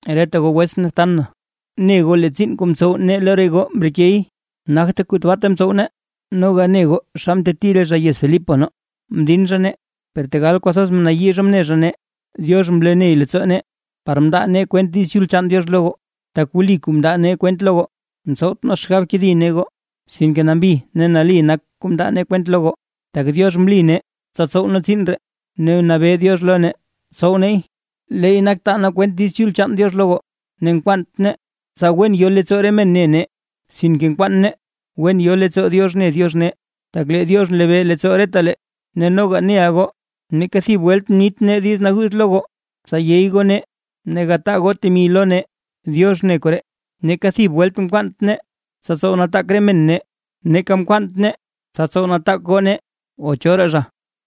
Reta goo wetsʼn ne btan na, ne goo lee tsiin kuu mtsow nee lo re goo mrekey, nagte kuu tabaata mtsow nee noga ne goo xa mteti re zha yez Filipos nee, mdin zha nee, per tegal kwathoz mnayii zha mne zha nee, Diox mloney leettsoo nee par mndaa nee kwent Diiz Chul chaan Diox lo goo. Tak wli kuu mndaa nee kwent lo goo, mtsowt nee xgab kedi nee goo, sinke nambi ne nali nak re kuu mndaa nee kwent lo goo. Tak Diox mli nee tsa tsow nee tsiin ree ne nabee Diox lo nee tsow neey, leey nak taa nee kwent Diiz Chul chaan Diox lo goo. Ne nkwaant nee tsa wen yo leettsoo re men ne nee, sinke nkwaan nee wen yo leettsoo Diox ne Diox nee, tak lee Diox nlebee leettsoo retalee. Ne noga neʼa goo, neeka thib welt mnit nee diiz naguuz lo goo tsa yey goo nee ne gataa goo temi lo nee, Diox ne koree. Neeka thib welt mkwaant nee tsa tsow nataak re men nee, neeka mkwaant nee tsa tsow nataak goo nee o choraa zha,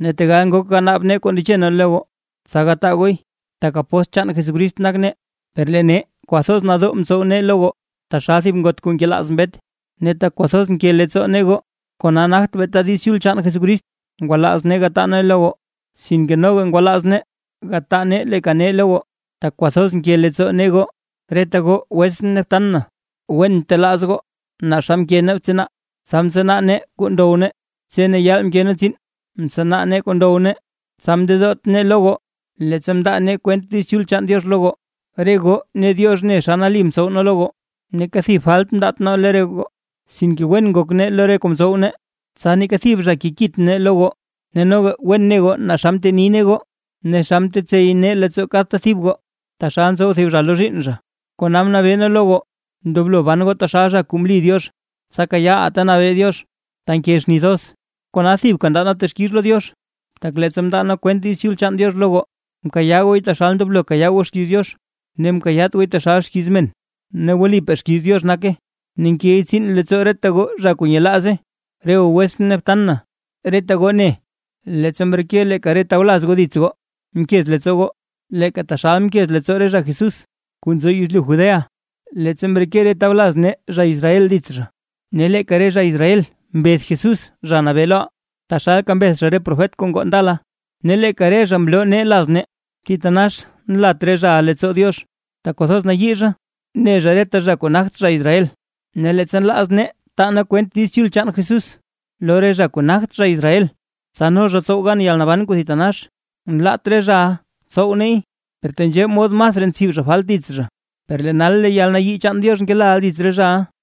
ne tegal ngok ganaab nee kuu ndeche nee lo goo, tsa gataa gooy, tak apóstl chaan Jesucrist nak nee. Per lee nee kwathoz nadoo mtsow nee lo goo, taxal thib ngot kuu nkelaaz mbet. Ne tak kwathoz nke leettsoo nee goo, kona nagt beeta Diiz Chul chaan Jesucrist ngwalaaz nee gataa nee lo goo, sinke noga ngwalaaz nee gataa nee leeka nee lo goo, tak kwathoz nke leettsoo nee goo. Reta goo wetsʼn ne btan na, wen ntelaaz goo naa xa mke nee btsanaa, tsa mtsanaa nee kuu ndow nee. Tse ne yaal mke nee tsiin mtsanaa nee kuu ndow nee, tsa mndedoot nee lo goo, leettsa mndaa nee kwent Diiz Chul chaan Diox lo goo. Re goo ne Diox ne xa nali mtsow nee lo goo, neeka thib falt mndaat nee lo re goo, sinke wen ngok nee lo goo lo re kuu mtsow nee, tsa neeka thib zha kekit nee lo goo. Ne noga wen ne goo naa xa mteni nee goo ne xa mtetsey nee leettsoo kadta thib goo, taxal ntsow thib zha lo zhiinn zha. Kona mnabee nee lo goo ndoblo ban goo taxal zha kuu mli Diox, tsa kayaaʼaa ta nabee Diox ta nke xni thoz. Kona thibka ndaa nee texkix lo Diox, tak leettsa mndaa nee kwent Diiz Chul chaan Diox lo goo, mkayaa gooy taxal ndoblo kayaa goo xkiiz Diox ne mkayaat gooy taxal xkiiz men. Ne wlipaa xkiiz Diox nake, ne nkey tsiin leettsoo reta goo zha kuu nyelaaze. Re goo wetsʼn ne btan na, reta goo ne leettsa mreke leeka re tawlaz goo dits goo, mkez leettsoo goo, leeka taxal mkez leettsoo re zha Jesús kuu nzo yezlyu Judea, leettsa mreke re tawlaz nee zha Israel dits zha. Ne leeka re zha Israel mbeth Jesús Zha Nabee loʼaa, taxalka mbeth zha re profet kuu ngoo ndala, ne leeka lee re zha mloo nee laz nee. Thitanax nlat re zhaʼa leettsoo Diox, tak kwathoz nayii zha ne zha reta zha kuu nagt zha Israel, ne leettsa nlaaz nee taa nee kwent Diiz Chul chaan Jesús lo re zha kuu nagt zha Israel, tsa no zha tsow gan yalnaban kuu thitanax, nlaat re zhaʼa tsow neey. Per tenzhee mod masraa ntsib zha falt dits zha. Per lee nal lee yalnayii chaan Diox ngelaʼa dits re zhaʼa.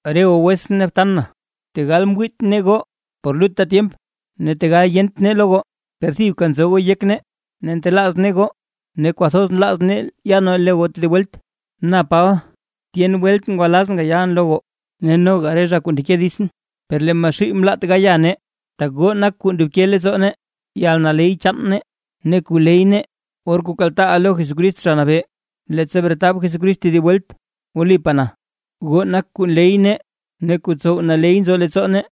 Re goo wetsʼn ne btan na, tegal ngwiit nee goo por lutta tyemp ne tegal yent nee lo goo, per thibka nzo goo yek nee, ne ntelaaz nee goo ne kwathoz nlaaz nee ya nee lo goo tedib welt. Na Paba, tyen welt ngwalazʼn gayalʼn lo goo, ne noga re zha kuu ndeke ditsʼn, per lee Maxuuy mlaat gaya nee. Tak goo nak kuu ndobke leettsoo nee, yalnaley chaan nee ne kuu ley nee, or kuu kaltaaʼaa lo Jesucrist Zha Nabee, leettsa bretab Jesucrist tedib welt. Wlipaa na, goo nak kuu nley nee ne kuu tsow naley nzo leettsoo nee.